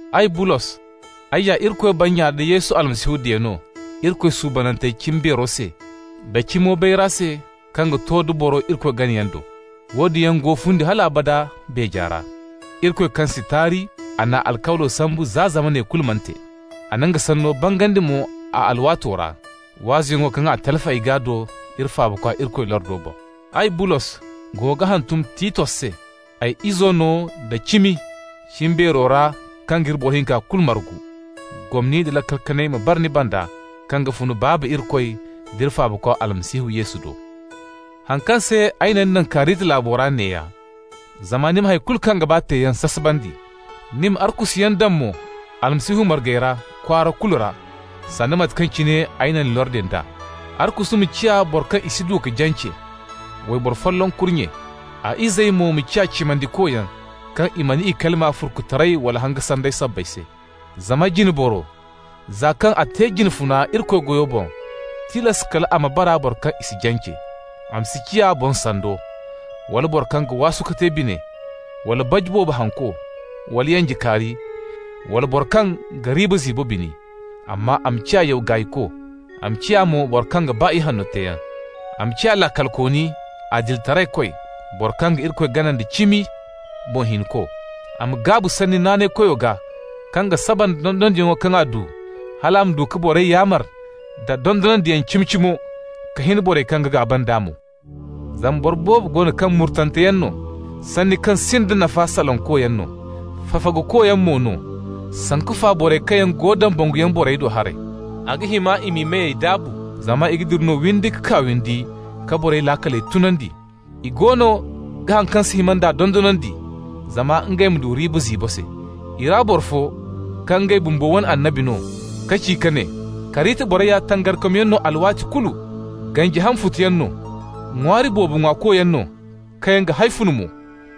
Ay Bulos, ay ya Irikoy bannya nda Yesu Almasihu diya no Irikoy suubanantey cimbeero se da cimo bayra se kaŋ ga to da boro Irikoy ganayaŋ do. Woodin yaŋ go fundi hal abada beeja ra. Irikoy kaŋ si taari, a n'a alkawlo sambu za zamaney kulu mana te. A na nga sanno bangandi mo a alwaato ra, waazuyaŋo kaŋ a talfi ay gaa do iri Faabakwa Irikoy lordo boŋ. Ay, Bulos, go ga hantum Titos se, ay izo no da cimi cimbeero ra kaŋ g'iri boro hinka kulu margu. Gomni nda laakal kanay ma bara ni banda kaŋ yaŋ ga fun Baaba Irikoy d'iri Faabakwa Almasihu Yesu do. Haŋ kaŋ se ay na ni naŋ Karita laabo ra neeya: zama ni ma hay kulu kaŋ ga ba teeyaŋ sasabandi, ni ma arkusuyaŋ daŋ mo Almasihu margey ra kwaara kulu ra, sanda mate kaŋ cine ay na ni lordi nd'a. Arkusu ma ciya boro kaŋ i si du ka jance, wayboro folloŋ kurnye. A izey mo ma ciya cimandikoyaŋ, kaŋ i mana i kalima furkutaray wala hanga sanday sabbay se. Zama jine boro, za kaŋ a ga te jine funa Irikoy goyo boŋ, tilas kal a ma bara boro kaŋ i si jance. A ma si ciya boŋ sando, wala boro kaŋ ga waasu ka te bine, wala baji boobo hanko, wala yanjekaari, wala mo boro kaŋ ga riiba ziibo bini. Amma a ma ciya yaw gaayko, a ma ciya mo boro kaŋ ga ba ihanno teeyaŋ. A ma ciya laakalkooni, adilitaraykoy, boro kaŋ ga Irikoy gana nda cimi, boŋ hinko. A ma gaabu sanni naanaykoyo gaa kaŋ ga saba nda dondonandiyaŋo kaŋ a du, hal a ma du ka borey yaamar da dondonandiyaŋ cimi-cimo, ka hin borey kaŋ ga gaaba nd'a mo. Zama boro boobo go no kaŋ murtanteyaŋ no, sanni kaŋ sinda nafa salankoyaŋ no, fafagukoyaŋ mo no, sanku fa borey kaŋ go dambanguyaŋ borey do haray. A ga hima i m'i meyey daabu, zama i ga dira no windi ka kaa windi ka borey laakaley tunandi. I goono ga haŋ kaŋ si hima dondonandi, zama ngey ma du riiba ziibo se. I ra boro fo, kaŋ ngey bumbo wane annabi no ka ci ka ne: «Karita borey ya tangarikomyaŋ no alwaati kulu. Ganji ham futoyaŋ no, ŋwaari boobo ŋwaakoyaŋ no kaŋ yaŋ ga hawfun mo.»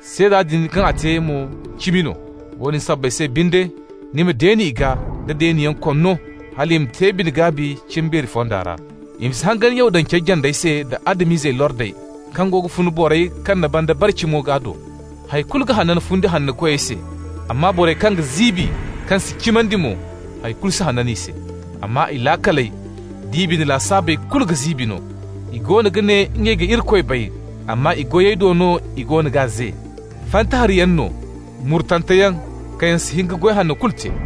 Seeda din kaŋ a te mo, cimi no. Woodin sabbay se binde, ni ma deeni i gaa da deeniyaŋ konno, hal i ma te gaabi cimbeeri fonda ra. I ma si hangan Yahudancey jandey se da Adam-izey lordey kaŋ goono ga fun borey kaŋ na banda bare cimo gaa do. Hay kulu ga hanan fundi hannokoyey se, amma borey kaŋ ga ziibi, kaŋ si cimandi mo, hay kulu si hanan i se. Amma i laakaley d'i bine lasaabey kulu ga ziibi no. I goono ga ne ngey ga Irikoy bay, amma i goyey do no i goono g'a ze. Fanta hariyaŋ no, murtanteyaŋ, kaŋ yaŋ si hin ka goy hanno kulu te.